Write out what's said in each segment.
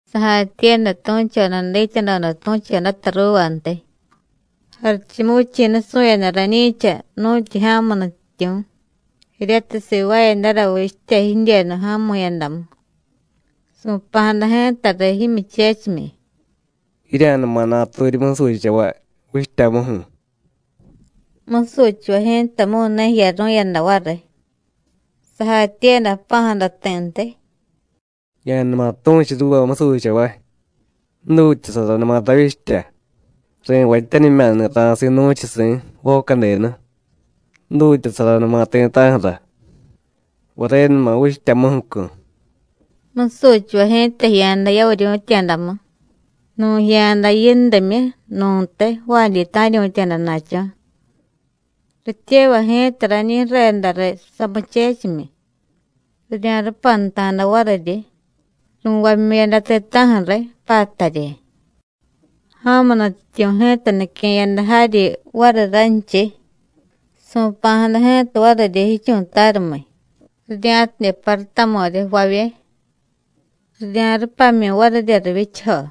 Sajatyiiyada tu̱choda dityadoda tu̱chodata ruuvantiy: “Jarichumuvichi̱ nusu̱yada rañi̱cha nu̱tyu ja̱mu nutyityu̱ jiryatiy sivaayadara vichtya jidyenu ja̱mu̱yadamu. Su̱pa̱jada ji̱tariy jimyuchechimyi: Jirya̱numa naturyi musuchavay vichtyamuju̱. Musuchavay ji̱tamu̱y ne jiyaru̱yada variy. Sajatyiiyada jpa̱jada ti̱ntiy: Ya̱numa tu̱chu ruuva musuchavay: Jdutyasaranuma ravyichtya. Ri̱vatyanimya̱ni̱ ra̱si̱ nu̱chusi̱, voca denu. Jdutyasaranuma ti̱ta̱ju̱ra. Varenuma vichtyamuju̱cu̱. Musuchavay ji̱ta jiya̱da yavuryu̱tya̱damu, nu̱ jiya̱da yindimyu, nu̱ntiy jvaadyi ta̱ryu̱tya̱da na̱cho̱. Rityevay ji̱ta rañi ju̱reda riy samuchechimyi, rirya̱rupanta̱da variryi, ru̱vamyu̱yada ti̱ta̱ju̱ riy, pattaryi. Ja̱mu nutyityu̱ ji̱ta nique̱yada jaryi variy ranchiy, su̱pa̱jada ji̱ta variryi jichu̱tarumiy, rirya̱tidye parutamu̱ryi jvavye, rirya̱rupamyu̱y varirya rivyichajo.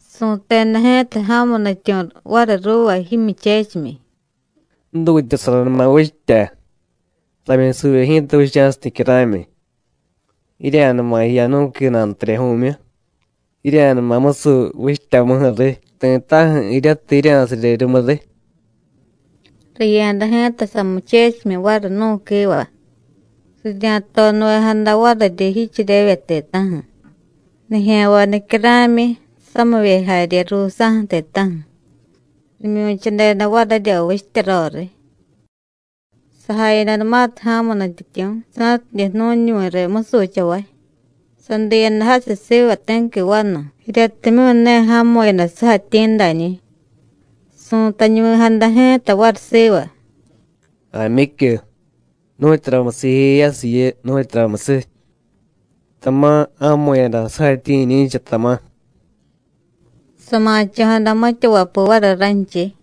Su̱teda ji̱ta ja̱mu nutyityu̱ variy ruuva jimyuchechimyi: Jdutyasaranuma vichtya, ramyusuvye ji̱ta vicha̱siy nicyara̱myi. Jirya̱numa jiya nú̱qui nantaryaju̱myu, jirya̱numa musuy vichtyamuju̱riy ti̱ta̱ju̱ jiryatiy jirya̱sarye rumuriy. Riya̱da ji̱ta samuchechimyi variy nú̱quiva, rirya̱tonuvejada variryi jicheryevye ti̱ta̱ju̱, nijya̱nvay nicyara̱myi, samivye jarye ruusa̱ju̱ ti̱ta̱ju̱. Rimyu̱chadeda varirya vichtya roriy. Sajayadanumatiy ja̱mu nutyityu̱ sa̱tidye jnu̱ñuvi̱ riy musuchavay, sadiyada jasiy siva ti̱qui vanu, jiryatimyu̱ ne ja̱mu̱yada sujatyi̱ dañi̱. Su̱tañuvi̱jada ji̱ta variy siva: Jaamyicyu, ¿nu̱tyuramusiy jijeyasiy jiyu, nu̱tyuramusiy? tama̱ ja̱mu̱yada sujatyi̱ jiñi̱cha, tama̱. Sama̱cho̱jada mitya vapuu variy ranchiy.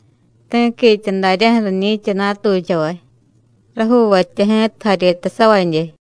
Ti̱quitya daryaju̱ riñi̱cha natuchavay, rajuuvatya ji̱ta jaryetasavadye.”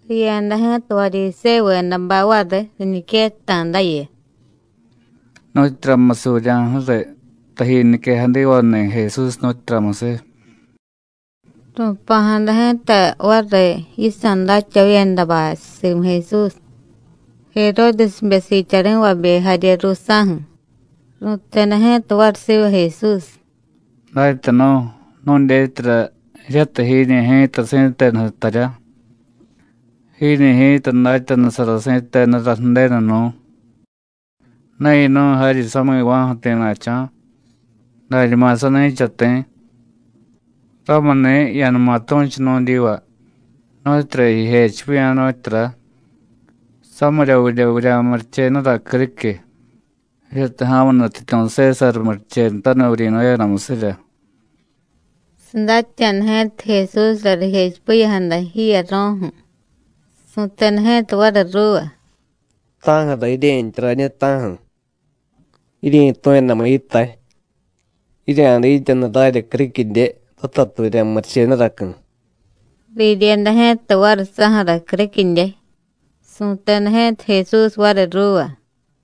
Riya̱da ji̱ta Varyisévuvedabay variy riñiquetta̱dayu: “¿Nu̱tyuramusiy vurya̱ju̱riy taji niquejadivani̱ Jesús, nu̱tyuramusiy?” Ru̱pa̱jada ji̱ta variy yisa̱ datyavavyedabay simu Jesús, Jeródesbe siityari̱vabe jarye ruusa̱ju̱. Ru̱teda ji̱ta variy siva Jesús: “Datyanu̱, nu̱dyetyara jiryatiy jiiñi̱ ji̱ta si̱tenu jtarya. Jiiñi̱ ji̱ta datyanusara si̱tenura Ju̱denu nú̱. Ne yinu̱y jaryi sami̱va̱ju̱ ti̱na̱cho̱, dañuma sani̱cha ti̱. Ramuni̱, ya̱numa tu̱chu nu̱dyiva, nu̱tyura jijechipiya̱, nu̱tyura: ¿Samiryavidye vurya̱murichenura criquiy, jiryatiy ja̱mu nutyityu̱ Sésar murichenutaniy vuryi̱nu̱yadamusirya?” Sadatya̱da ji̱ta Jesúsra rijechipiya̱jada jiyaro̱ju̱, su̱teda ji̱ta variy ruuva: “¿Ta̱ju̱ra jirye̱ntya rañiy, ta̱ju̱? Jiryi̱tu̱yadamu yitay. Jirya̱dityanu rarya criquidye, ratatiy vurya̱murichenuracu̱.” Riryeda ji̱ta variy saju̱ra criquidye. Su̱teda ji̱ta Jesús variy ruuva: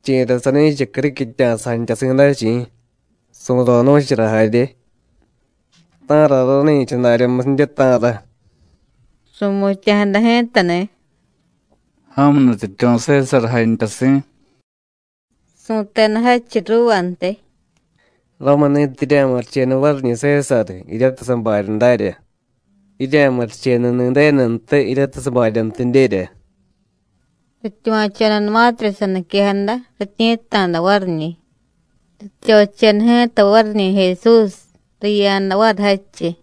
“¿Chi̱ra sani̱cha criquitya̱sa jantyasi̱ day, chi̱? su̱ro̱ nu̱chara jarye, ¿ta̱ra rani̱cha daryamusidye, ta̱ra?” Ru̱mutya̱jada ji̱tani̱: “Ja̱mu nutyityu̱ Sésar jantyasi̱.” Su̱teda jadchiy ruuvantiy: “Ramuni̱tiy jirya̱murichenu variñi̱ Sésar jiryatiy sabarya darya, jirya̱murichenuni̱ Ju̱denuntiy jiryatiy sabaryantidyerya.” Rityuva̱chodanumatirya saniquejada, rityi̱tta̱da variñi̱. Rityocheda ji̱ta variñi̱ Jesús, riya̱da variy jadchiy.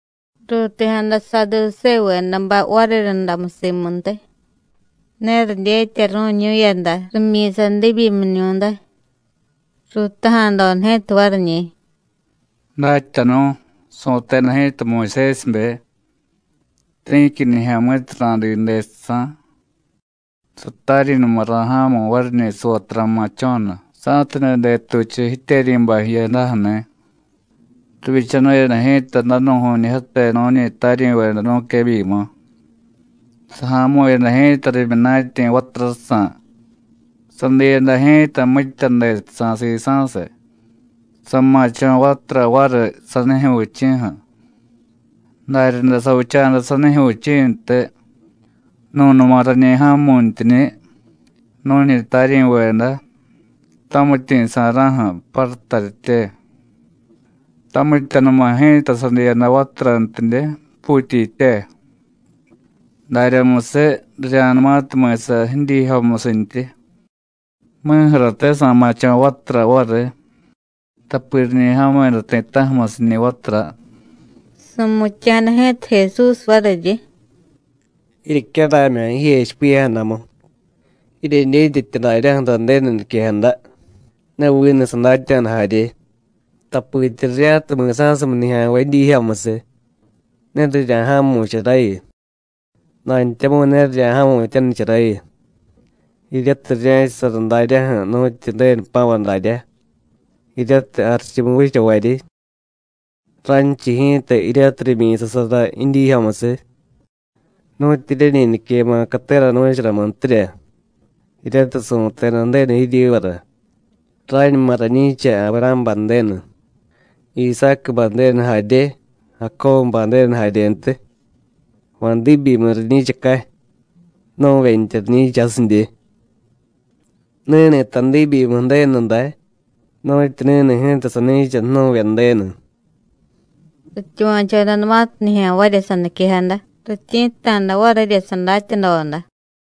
Ruuti̱jada Saadusévuvedabay variryundamu simuntiy. Ne ridyetaru̱ñu̱yada rimyi̱sa diibyimiñu̱day. Ruutaja̱doda ji̱ta variñi̱: “Datyanu̱, su̱teda ji̱ta Muyusésibe: Ti̱qui nijya̱mi̱tiy ra̱diiy dejsa̱, sataryi̱numa ra̱ja̱mu̱y variñi̱ savatura ma̱cho̱nu, sa̱tidye detuchu jityeryi̱bay jiyadaju̱ni̱. Rivyichanu̱yada ji̱ta danu̱ju̱ñijyate nu̱ñi taryi̱veda nu̱quebyimu. Saja̱mu̱yada ji̱ta rimyunatyi̱ vaturajsa̱, sadiiyada ji̱ta mitya dejsa̱ sisa̱siy, sama̱cho̱ vatura variy sanijyu̱ vichi̱ju̱. Daryaday savicha̱da sanijyu̱ vichi̱ntiy, nu̱numa rañi ja̱mu̱ntyiñi̱, nu̱ñi taryi̱veda, tamityi̱ sa̱ra̱ju̱, pattaryitye. Tamityanuma ji̱ta sadiiyada vaturantidye, puutyitye. Daryamusiy, rirya̱numatiy mi̱sa jidyiijyomusintyi, mi̱ju̱rate sa̱ma̱cho̱ vatura variy, tapi riñi ja̱mu̱yada ti̱ta̱ju̱musiñi̱ vatura.” Su̱mutya̱jada ji̱ta Jesús variryi: “Jiryecyaramya̱ jijechipiya̱jadamu, jiryedyetyatya daryaju̱ra Ju̱denu niquejada, ne vinu sadatya̱da jarye. Tapitya rirya̱tiy mi̱sa̱sumiy nijya̱nvay jidyiijyomusiy, ne rirya̱ja̱mu̱charayu, dantyamu̱y ne rirya̱ja̱mu̱tyanicharayu, jiryatiy rirye̱chasara daryaju̱ nu̱tyu Ju̱denu jpa̱vay daryá, jiryatiy jarichumu vichavaryi. Ranchiy ji̱ta jiryatiy rimyi̱sasara jidyiijyomusiy, nu̱tyi jiryeñi niquema̱ catera nu̱charamuntirya, jiryatiy su̱teda Ju̱denu jiryivara: Rañuma rañi̱cha Avurá̱bay Ju̱denu, Isácubay Ju̱denu jarye, Jacóbubay Ju̱denu jaryentiy. ¿Va̱ diibyimiy riñi̱chacay? ¡Jnu̱vyentya riñi̱cha jasidye! Ni̱ni̱ta diibyimiy Ju̱denu day, nu̱tyi ni̱ni̱ ji̱ta sani̱cha jnu̱vye Ju̱denu.” Rityuva̱chodanumatiy nijya̱nvarya saniquejada, rityi̱tta̱da varirya sadatyadoda.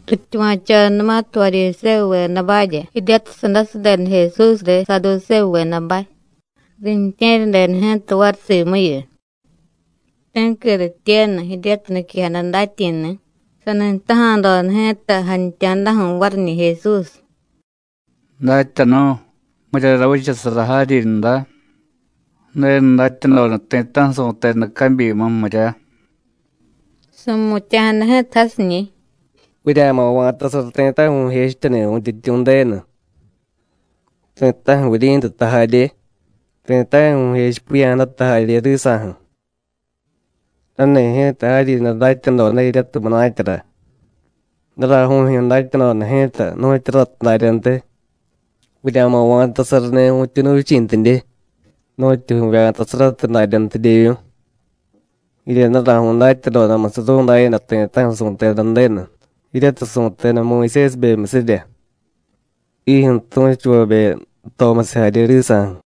Rityuva̱chodanumatiy Varyisévuvedabarya jiryatiy sandasadeda Jesús riy Saadusévuvedabay, riintye̱ryadeda ji̱ta variy simuyu. Ti̱qui rityenu jiryatiy niquejada datyi̱ni̱, sani jtaja̱doda ji̱ta jantya̱daju̱ variñi̱ Jesús: “Datyanu̱, ¿miryara vichasara jaryinra Ju̱denu datyadoda ti̱ta̱ju̱ su̱teda cabyimu, mirya?” Su̱mutya̱jada ji̱ta jasiñi̱: “Vurya̱ma̱ va̱tasara ti̱ta̱ju̱ vu̱jechityani̱ Vu̱ntyityu̱ Ju̱denu, ti̱ta̱ju̱ vuryi̱ntuta jarye, ti̱ta̱ju̱ vu̱jechipiya̱jadata jarye risa̱ju̱. Rani̱ ji̱ta jaryinra datyadoda jiryatiy munatyara. Daraju̱jyu̱ datyadoda ji̱ta nu̱tyu ratiy daryantiy: Vurya̱ma̱ va̱tasarani̱ vu̱tyuunu vichi̱ntidye, nu̱tyu vu̱vya̱tasaratiy daryantidyevyu̱y. Jirya daraju̱y datyadodamusiy ru̱ndayada ti̱ta̱ju̱ su̱teda Ju̱denu, jiryatiy su̱teda Muyusésibemyusirya, jijyu̱ tu̱chuvabe jtomusiy jarye risa̱ju̱.”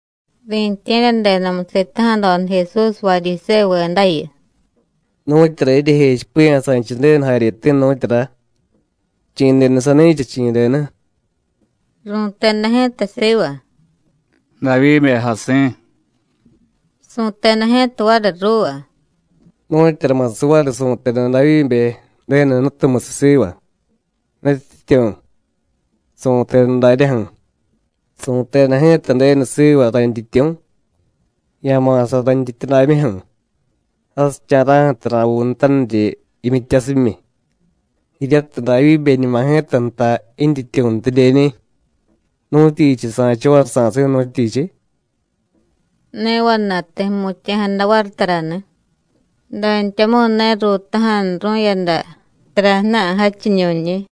Riintye̱ryadedamu, sitaja̱doda Jesús Varyisévuvedayu: “¿Nu̱tyura jiryejechipiya̱ sanchiy Ju̱denu jaryeti̱, nu̱tyura? ¿Chi̱ denu sani̱cha, chi̱ denu?” Ru̱teda ji̱ta siva: “Davyíbe jasi̱.” Su̱teda ji̱ta variy ruuva: “Nu̱tyuramusiy variy su̱teda Davyíbe, Ju̱denu Jnutumusiy siva: ¡Nutyityu̱! Su̱teda daryaju̱: Su̱teda ji̱ta Ju̱denu siva rayntyityu̱: Ya̱ma̱sa rayntyityudamyuju̱, jasicha̱ra̱ju̱tiy ra̱vuunutaniryi jimyityasimyi. Jiryatiy Davyíbeñuma ji̱ta jtay jintyityu̱ntidyeñi̱, ¿nu̱tyichiy sa̱cha variy sa̱si̱, nu̱tyichiy?” Ne vana̱y ti̱ jmutya̱jada variy tarani̱, dantyamu̱y ne ruutaja̱nuru̱yada tara ju̱na̱y jadchiñu̱nñi̱.